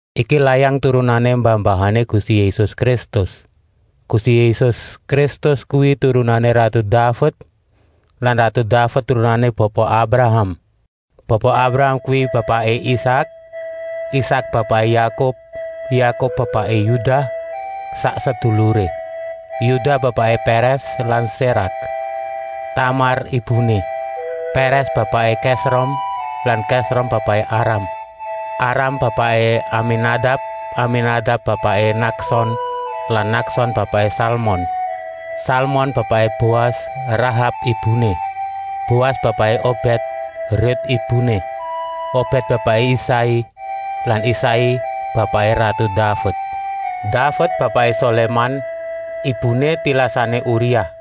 Iki layang turunané mbah-mbahané Gusti Yésus Kristus. Gusti Yésus Kristus kuwi turunané ratu Daved lan ratu Daved turunané Bapa Abraham. Bapa Abraham kuwi bapaké Isak, Isak bapaké Yakub, Yakub bapaké Yudah sak seduluré. Yudah bapaké Pèrès lan Sérak, Tamar ibuné. Pèrès bapaké Kèsrom lan Kèsrom bapaké Aram. Aram bapaké Aminadab, Aminadab bapaké Nakson lan Nakson bapaké Salmon. Salmon bapaké Boas, Rahab ibuné. Boas bapaké Obèd, Rut ibuné. Obèd bapaké Isai lan Isai bapaké ratu Daved. Daved bapaké Soléman, ibuné tilasané Uriah.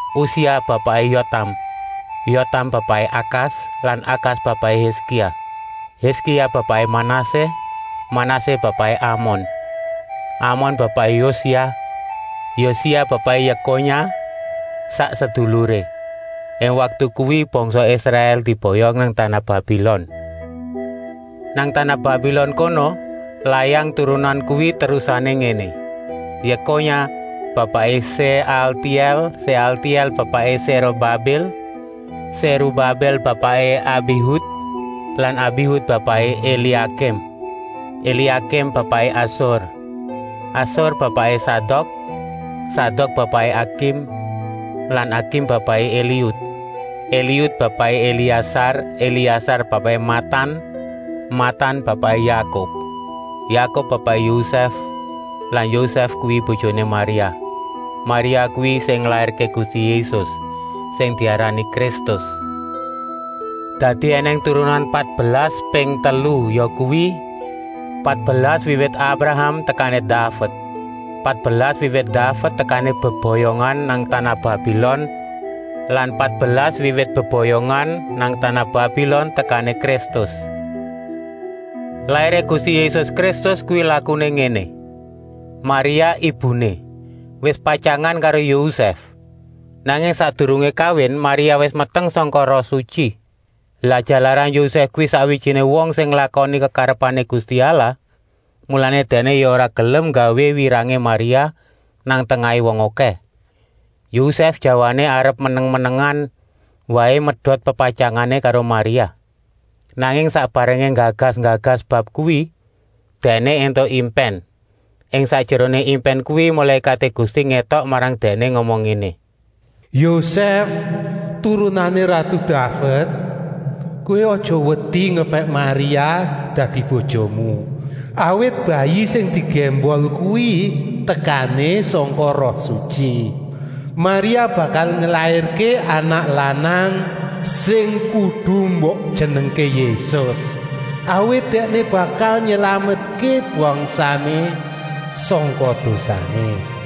Usia bapaké Yotam, Yotam bapaké Akas lan Akas bapaké Hiskia. Hiskia bapaké Manasé, Manasé bapaké Amon, Amon bapaké Yosia. Yosia bapaké Yekonya sak seduluré. Ing waktu kuwi bangsa Israèl diboyong nang tanah Babilon. Nang tanah Babilon kono layang turunan kuwi terusané ngéné: Yekonya bapaké Séaltièl, Séaltièl bapaké Sérubabil. Sérubabil bapaké Abihud lan Abihud bapaké Eliakim. Eliakim bapaké Asur. Asur bapaké Sadok, Sadok bapaké Akim lan Akim bapaké Eliud. Eliud bapaké Eliasar, Eliasar bapaké Matan, Matan bapaké Yakub. Yakub bapaké Yosèf lan Yosèf kuwi bojoné Maria. Maria kuwi sing nglairké Gusti Yésus, sing diarani Kristus. Dadi ènèng turunan patbelas ping telu, yakuwi: Patbelas wiwit Abraham tekané Daved, patbelas wiwit Daved tekané beboyongan nang tanah Babilon lan patbelas wiwit beboyongan nang tanah Babilon tekané Kristus. Lairé Gusti Yésus Kristus kuwi lakuné ngéné: Maria, ibuné, wis patyangan karo Yosèf. Nanging sakdurungé kawin Maria wis meteng sangka Roh Sutyi. Lah jalaran Yosèf kuwi sakwijiné wong sing nglakoni kekarepané Gusti Allah, mulané dèkné ya ora gelem nggawé wirangé Maria nang tengahé wong okèh. Yosèf jawané arep meneng-menengan waé medot pepatyangané karo Maria. Nanging sak barengé nggagas-nggagas bab kuwi, dèkné éntuk impèn. Ing sakjeroné impèn kuwi mulékaté Gusti ngétok marang dèkné ngomong ngéné: “Yosèf, turunané ratu Daved, kowé aja wedi ngepèk Maria dadi bojomu, awit bayi sing digémbol kuwi tekané sangka Roh Sutyi. Maria bakal nglairké anak lanang sing kudu mbok jenengké Yésus, awit Dèkné bakal nylametké bangsané sangka dosané.”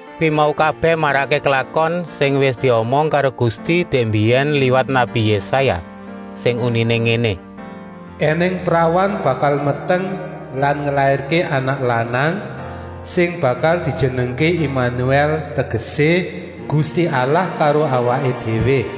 Kuwi mau kabèh marakké klakon sing wis diomong karo Gusti dèk mbiyèn liwat nabi Yésaya, sing uniné ngéné: “Enèng prawan bakal meteng lan nglairké anak lanang, sing bakal dijenengké Imanuèl, tegesé: Gusti Allah karo awaké déwé.”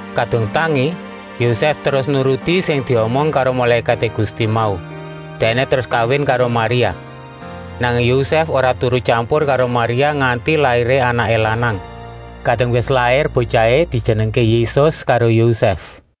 Kadung tangi, Yosèf terus nuruti sing diomong karo mulékaté Gusti mau. Dèkné terus kawin karo Maria. Nanging Yosèf ora turu tyampur karo Maria nganti lairé anaké lanang. Kadung wis lair botyahé dijenengké Yésus karo Yosèf.